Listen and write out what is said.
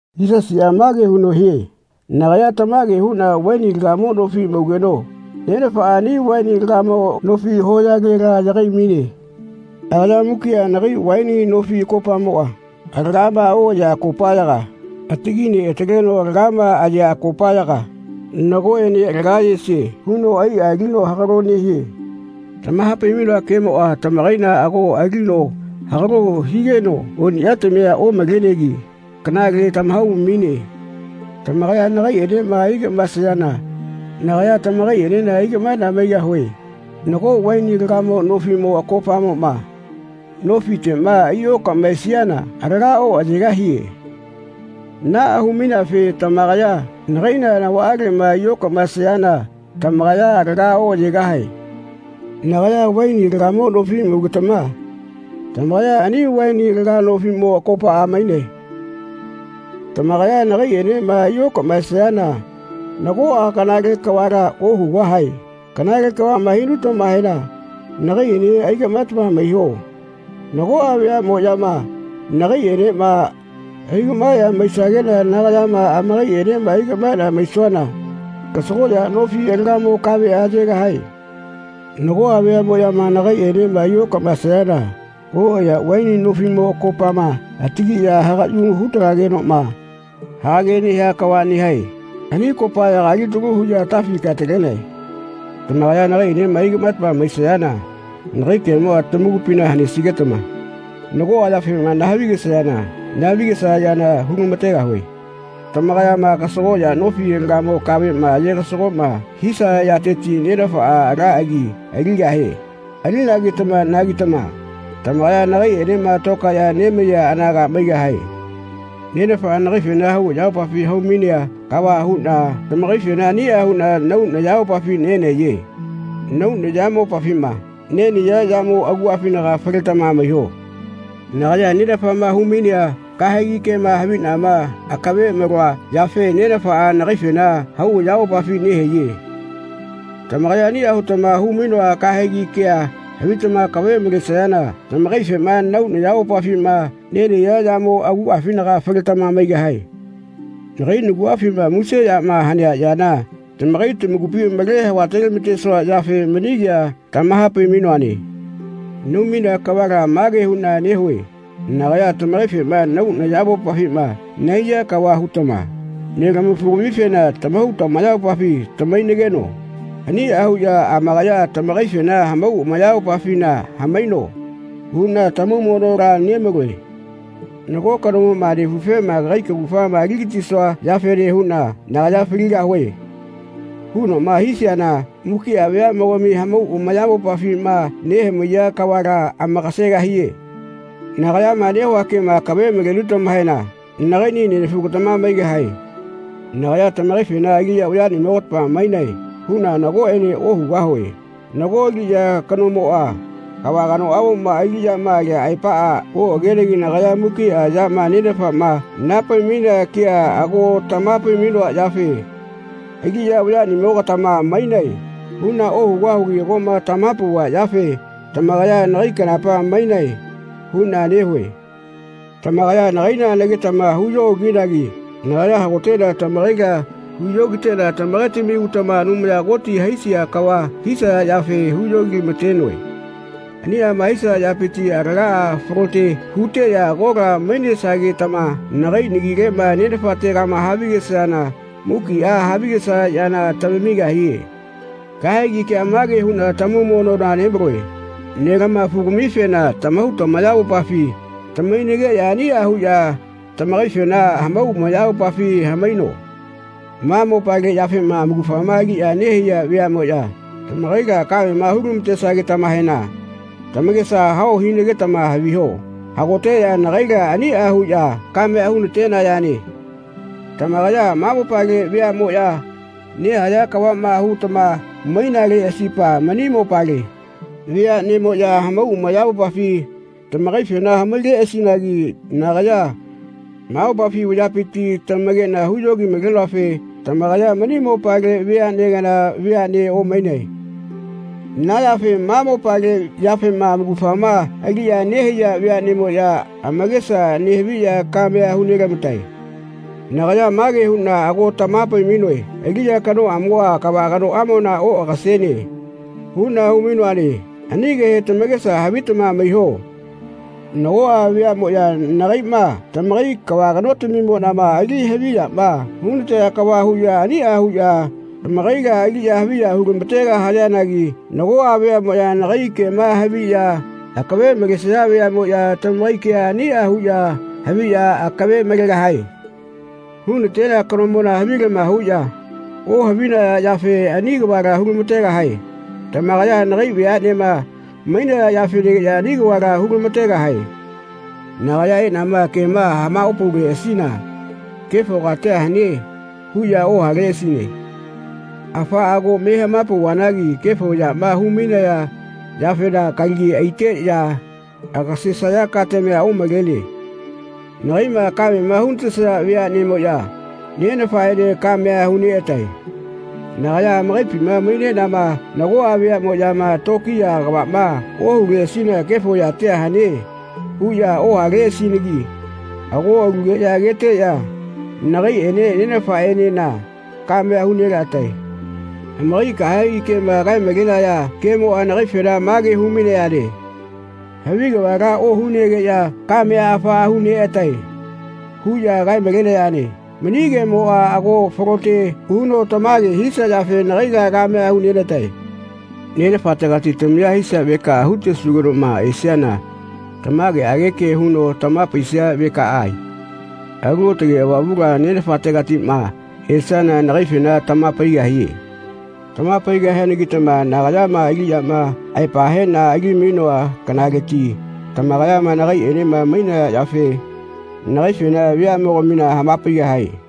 Yisasiꞌa mage huno hie “Nagaya tamage huꞌna vaini alagamo nofi maugeno Nenafaꞌa ani vaini alagamo nofi hoyalela yagai-maine. Agaya mukiꞌa nagai vaini nofi akopaꞌmoꞌa alagama oꞌayea akopaꞌyaga atagi neꞌataleno alagama ayea akopaꞌyaga ‘Nagoꞌene alaga ayesie.’ huno aiꞌa alino hagalo nehie. Tamaha-pai-mainoa kemoꞌa tamakaila ago alino hagalo higeno oniꞌyatamia omalenegi kanale tamahau-maine. Tamakaya nagaiꞌenema ai-gaꞌmaesayana nagaya tamakaiꞌenena ai-gaꞌmaeꞌna maigahue. Nago vaini alagamo nofiꞌmo akopamoꞌma nofiteꞌma ai-okaꞌmaesiana alaga oꞌayegahie. Naꞌa hu-maineafe tamakaya nagaila navaꞌaleꞌma ai-okaꞌmaesayana tamakaya alaga oꞌayegahae. Nagaya vaini alagamo nofi maugetama tamakaya ani vaini alaga nofiꞌmo akopaꞌa mainae. Tamakaya nagaiꞌenema ai okaꞌmaesayana nagoꞌa kanale kavala ohugahae. Kanale kavaꞌma hinutamahena nagaiꞌene ai-kaꞌmaetama maiho. Nagoꞌa veaꞌmoꞌyama nagaiꞌenema ai-gaꞌmaeꞌya maisageꞌna nagayama amakaiꞌenema ai-kaꞌmaeꞌna maisuana kasagoꞌya nofi alagamo kaveꞌa ayegahae. Nagoꞌa veaꞌmoꞌya nagaiꞌenema ai-okaꞌmaesayana oꞌayea vaini nofiꞌmo akopaꞌma atagiꞌya hagaꞌyu hu-talagenoꞌma hagage nehia kava nehae. Ani akopayaga alitalu huꞌya atafi kae-talenae. Tamakaya nagaiꞌenema aigaꞌmaetama maisayana nagai kemoꞌa tamakupina hanesigetama nagoꞌa yafema naha-vi-gesayana naha-vi-gesaya yana hu-lama-tegahue. Tamakayama kasagoꞌya nofi alagamo kaveꞌma aye-gasagoꞌma hisaya yateti Nenafaꞌa ala agia aligahie. Alinagetama-nagitama tamakaya nagaiꞌenema tokaeꞌya nemaiya anaga maigahae. Nenafaꞌa nagaifena hau ayamopafi hau-mainea kava huꞌna tamakaifena aniꞌa huꞌna nahau nayamopafi nenahaiye. Nahau nayamopafima nenahaiya yamo aguꞌafinaga faletama maiho. Nagaya Nenafaꞌma hu-mainea kahegi kema haviꞌnama akave maloa yafe Nenafaꞌa nagaifena hau ayamopafina nehaiye. Tamakaya aniꞌa hutama hu-mainoa kahegi kea havitama akave malesayana tamakaifema nahau nayamopafi nenahaiya yamo aguꞌafinaga faletama maigahae. Nagai naguꞌafima muse yama hanea yana tamakai tamakupi male hava-telama-tesua yafe mani kea tamaha-pai-mainoane. Nahau-mainea kavala mage huꞌna nehue ‘Nagaya tamakaifema nahau nayamopafima nahaiya kava hutama nelama-fugamifena tamahau tamayamopafi tamahainageno aniꞌa huꞌya amakaya tamakaifena hamau amayamopafina hamaino.’ huꞌna tamaumonola nemaloe. Nago kanomoꞌma nefufema ‘Kagai kaugafama ali-gatisua yafene huꞌna nagaya faligahue.’ hunoꞌma hisiana mukiꞌa veaꞌmogami hamau amayamopafima nehamaiya kavala amakasegahie. Nagayama nehua kema akave malenutamahena nagaiꞌni nenafugatama maigahae. Nagaya tamakaifena ‘Aliꞌya vayaꞌnimogatama mainae.’ huꞌna nagoꞌene ohugahue. Nago aliꞌya kanomoꞌa kava kanoꞌamoma aliꞌyama alia aepaꞌa oꞌagenegi nagaya mukiꞌa yama Nenafaꞌma naha-pai-mainea kea ago tamaha-pai-mainoa yafe ‘Aliꞌya vayaꞌnimogatama mainae.’ huꞌna ohugahugi agoꞌma tamaha-nepauva yafe ‘Tamakaya nagai kanapa mainae.’ huꞌna nehue. Tamakaya nagaila nagetama hu-yoꞌokinagi nagaya hagoteꞌna tamakaila tamakeꞌna hu-yogiteꞌna tamakaitami utama Anumaya Koti haisia kava hisaya yafe hu-yogilama-tenoe. Aniꞌama hisaya yapiti alagaꞌa falote huteꞌya agola mainesagetama nagai nagileꞌma Nenafatega havigesayana mukiꞌa havigesaya yana tamamigahie. Kahegi kea mage huꞌna tamaumonola nemaloe nelama-fugamifena tamahau tamayamopafi tamahainageꞌya aniꞌa huꞌya tamakaifena hamau amayamopafi hamaino.” “Ma mopale yafema amaugafama aliꞌya nehaiya veaꞌmoꞌya tamakaila kamema hu-lama-tesagetamahena tamakesa hao hinagetama haviho. Hagoteꞌya nagaila aniꞌa huꞌya kamea hu-na-tenayane. Tamakaya ma mopale veaꞌmoꞌya nehaya kavaꞌma hutama mainaleꞌasipa mani mopale veaꞌnemoꞌya hamau amayamopafi tamakaifena hamaileꞌasinagi nagaya ma mopafi vayapiti tamakeꞌna hu-yogi-malenoafe tamakaya mani mopale vea kana veaꞌne omainae. Na yafe ma mopale yafema amaugafama aliꞌya nehaiya veaꞌnemoꞌya amakesa nehaviꞌya kamea hu-nelama-tae. Nagaya mage huꞌna ago tamaha-pai-mainoe ‘Aliꞌya kanoꞌamoꞌa kava kanoꞌamona oꞌagasene.’ huꞌna hu-mainoane. Ani kehe tamakesa havitama maiho. Nagoꞌa veaꞌmoꞌya nagaiꞌma, tamakai kava kanotamimonima, aliꞌya haviyama hu-na-taya kava huꞌya aniꞌa huꞌya tamakaila aliꞌya haviya hu-lama-tegahayanagi nagoꞌa veaꞌmoꞌya nagai kema haviꞌya akave nemalesaya veaꞌmoꞌya tamakai kea aniꞌa huꞌya haviꞌya akave malegahae. Hu-na-tenea kanomona havilama huꞌya ohavinaya yafe ani kavala hu-lama-tegahae. Tamakaya nagai veaꞌnema mainaya yafenagiꞌya ani kavala hu-lama-tegahae. Nagaya eꞌnama kema hama-opauleꞌasina ‘Kefo katia hane.’ huꞌya ohaleꞌasine. Afaꞌa ago me hama-pauvanagi kefo yama hu-mainaya yafena kalagi aiteꞌya agasesaya katamia omalene. Nagaiꞌma kamema hu-na-tesaya veaꞌnemoꞌya Nenafaꞌene kamea hu-neꞌatae. Nagaya amakaipima maineꞌnama nagoꞌa veaꞌmoꞌyama tokiya kavaꞌma ohuleꞌasina ‘Kefo yatia hane.’ huꞌya ohaleꞌasinagi ago alugeꞌya ageteꞌya nagaiꞌene Nenafaꞌenena kamea hu-nelaꞌa-tae. Amakai kahegi kema kae-malenaya kemoꞌa nagaifena mage hu-mainayane ‘Havi kavala ohunegeꞌya kamea afaꞌa hu-neꞌa-tae.’ huꞌya kae-malenayane. Mani kemoꞌa ago falote huno tamage hisia yafe nagaila kamea hu-nena-tae. Nenafategati tamaya hisia vekaꞌa hu-tesugenoꞌma esiana tamageꞌage ke huno tamaha-paisia vekaꞌa, Alu Aotage Avamula Nenafategatiꞌma esiana nagaifena tamaha-paigahie. Tamaha-paigahianagitama nagaya aliꞌyama aepa heꞌna ali-mainoa kanaleti tamakayama nagaiꞌenema mainaya yafe nagaifena veaꞌmogamina hama-paigahae.”